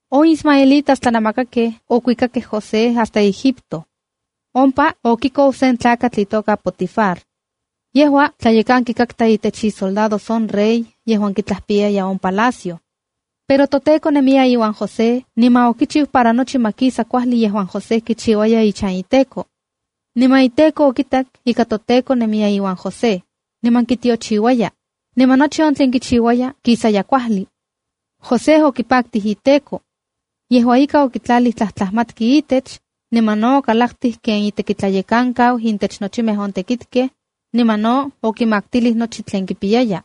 On ismaelitas tlanamakakej okuikakej José hasta Egipto. Ompa okikou sen tlakatl itoka Potifar. Yejua tlayekanki intech isoldados on rey yejuan kitlajpiyaj on palacio. Pero toTEKO nemiya iuan José niman okichiu para nochi ma kisa kuajli yejuan José kichiuaya ichan iteko. Niman iteko okitak ika toTEKO nemiya iuan José, niman kitiochiuaya, niman nochi on tlen kichiuaya kisaya kuajli. José okipaktij iteko. Yejua ika, okitlalij tlajtlajmatki itech, niman no okalaktij ken itekitlayekankau intech nochimej on tekitkej, niman no okimaktilij nochi tlen kipiyaya.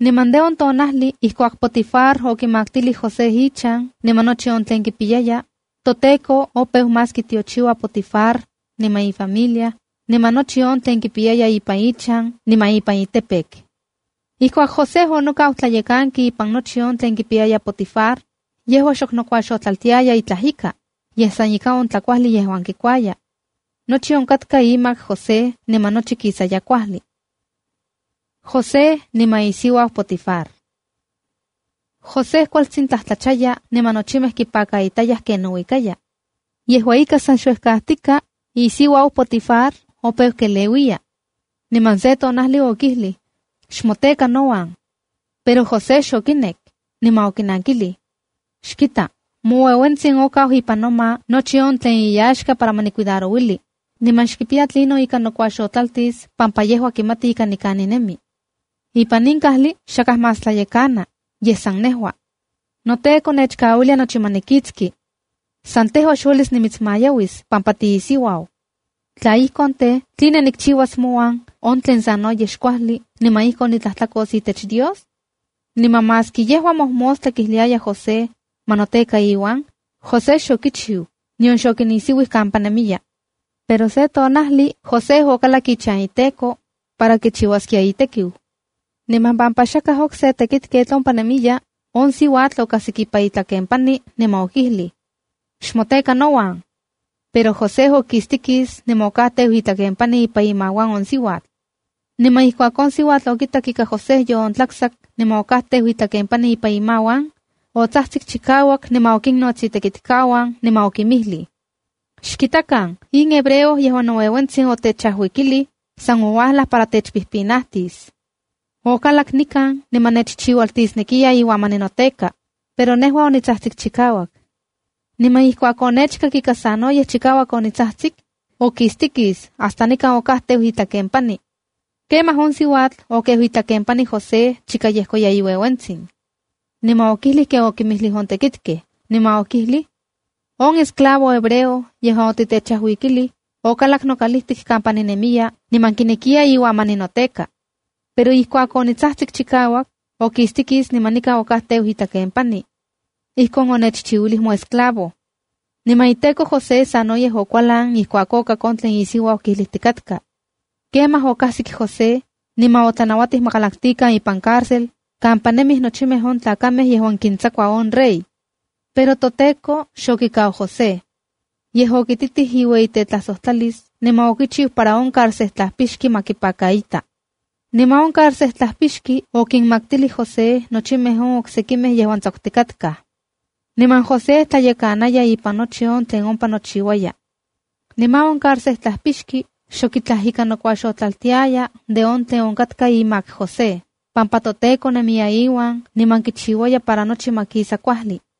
Niman de on tonajli ijkuak Potifar okimaktilij José ichan niman nochi on tlen kipiyaya, toTEKO opeu más kitiochiua Potifar, niman ifamilia, niman nochi on tlen kipiya ipan ichan niman ipan campo. Ijkuak José onokau tlayekanki ipan nochi on tlen kipiyaya Potifar, yejua xok nokuaxotlaltiaya itlaj ika, yej san ika on tlakuajli yejuan kikuaya. Nochi onkatka imak José niman nochi kisaya kuajli. José niman isiuau Potifar José kualtsin tlajtlachaya niman nochimej kipakaitayaj ken nouikaya, yejua ika san xuejkajtika, isiuau Potifar opeu keleuiya. Niman se tonajli okijlij: —Xmoteka nouan. Pero José xokinek, niman okinankilij: —Xkita, moueuentsin okau ipan noma nochi on tlen iyaxka para ma nicuidarouli, niman xkipiya tlinon ika nokuaxotlaltis pampa yejua kimati ika nikan ninemi. Ipan in kajli xakaj más tlayekana, yej san nejua. Noteko nechkauilia nochi ma nikitski. San tejua xniuelis nimitsmayauis pampa tiisiuau. Tla ijkon tej, ¿tline nikchiuas mouan on tlen sanoyej xkuajli mouan, niman ijkon nitlajtlakos itech Dios? Niman maski yejua mojmostla kijliaya José, ma noteka iuan, José xokichiu, nion xokinisiuij kampa nemiya. Pero se tonajli José okalak ichan iteko, para kichiuaskia itekiu. Niman pampa xakaj okse tekitketl ompa nemiya, on siuatl okajsik ipan itlakenpani niman okijlij: —Xmoteka nouan. Pero José okistikis niman okajteu itlakenpani ipan imauan on siuatl. Niman ijkuak on siuatl okitak ika José yoontlaktsak niman okajteu itlakenpani ipan imauan, otsajtsik chikauak niman okinnots itekitkauan, niman okinmijlij: —Xkitakan, in hebreo yejuan noueuentsin otechajuikilij, san ouajlaj para techpijpinajtis. Okalak nikan niman nechchiualtisnekiya iuan ma ninoteka, pero nejua onitsajtsik chikauak. Niman ijkuak onechkak ika sanoyej chikauak onitsajtsik, okistikis hasta nikan okajteu itlakenpani. Kemaj on siuatl okeu itlakenpani José chika yejkoya iueuentsin. Niman okijlij ken okinmijlij on tekitkej, niman okijlij: —On esclavo hebreo yejuan otitechajuikilij, okalak nokalijtik kampa ninemiya, niman kinekiya iuan ma ninoteka. Pero ijkuak onitsajtsik chikauak, okistikis niman nikan okajteu itlakenpani. Ijkon onechchiuilij moesclavo. Niman iteko José sanoyej okualan ijkuak okak on tlen isiuau kijlijtikatka. Kemaj okajsik José, niman otlanauatij ma kalaktikan ipan cárcel kampa nemij nochimej on tlakamej yejuan kintsakua on rey. Pero toTEKO xokikau José. Yej okititij iueyitetlajsojtlalis, niman okichiu para on carcejtlajpixki ma kipakaita. Niman on carcejtlajpixki okinmaktilij José nochimej on oksekimej yejuan tsakutikatkaj. Niman José tlayekanaya ipan nochi on tlen ompa nochiuaya. Niman on carcejtlajpixki xok itlaj ika nokuaxotlaltiaya de on tlen onkatka imak José pampa toTEKO nemiya iuan niman kichiuaya para nochi ma kisa kuajli.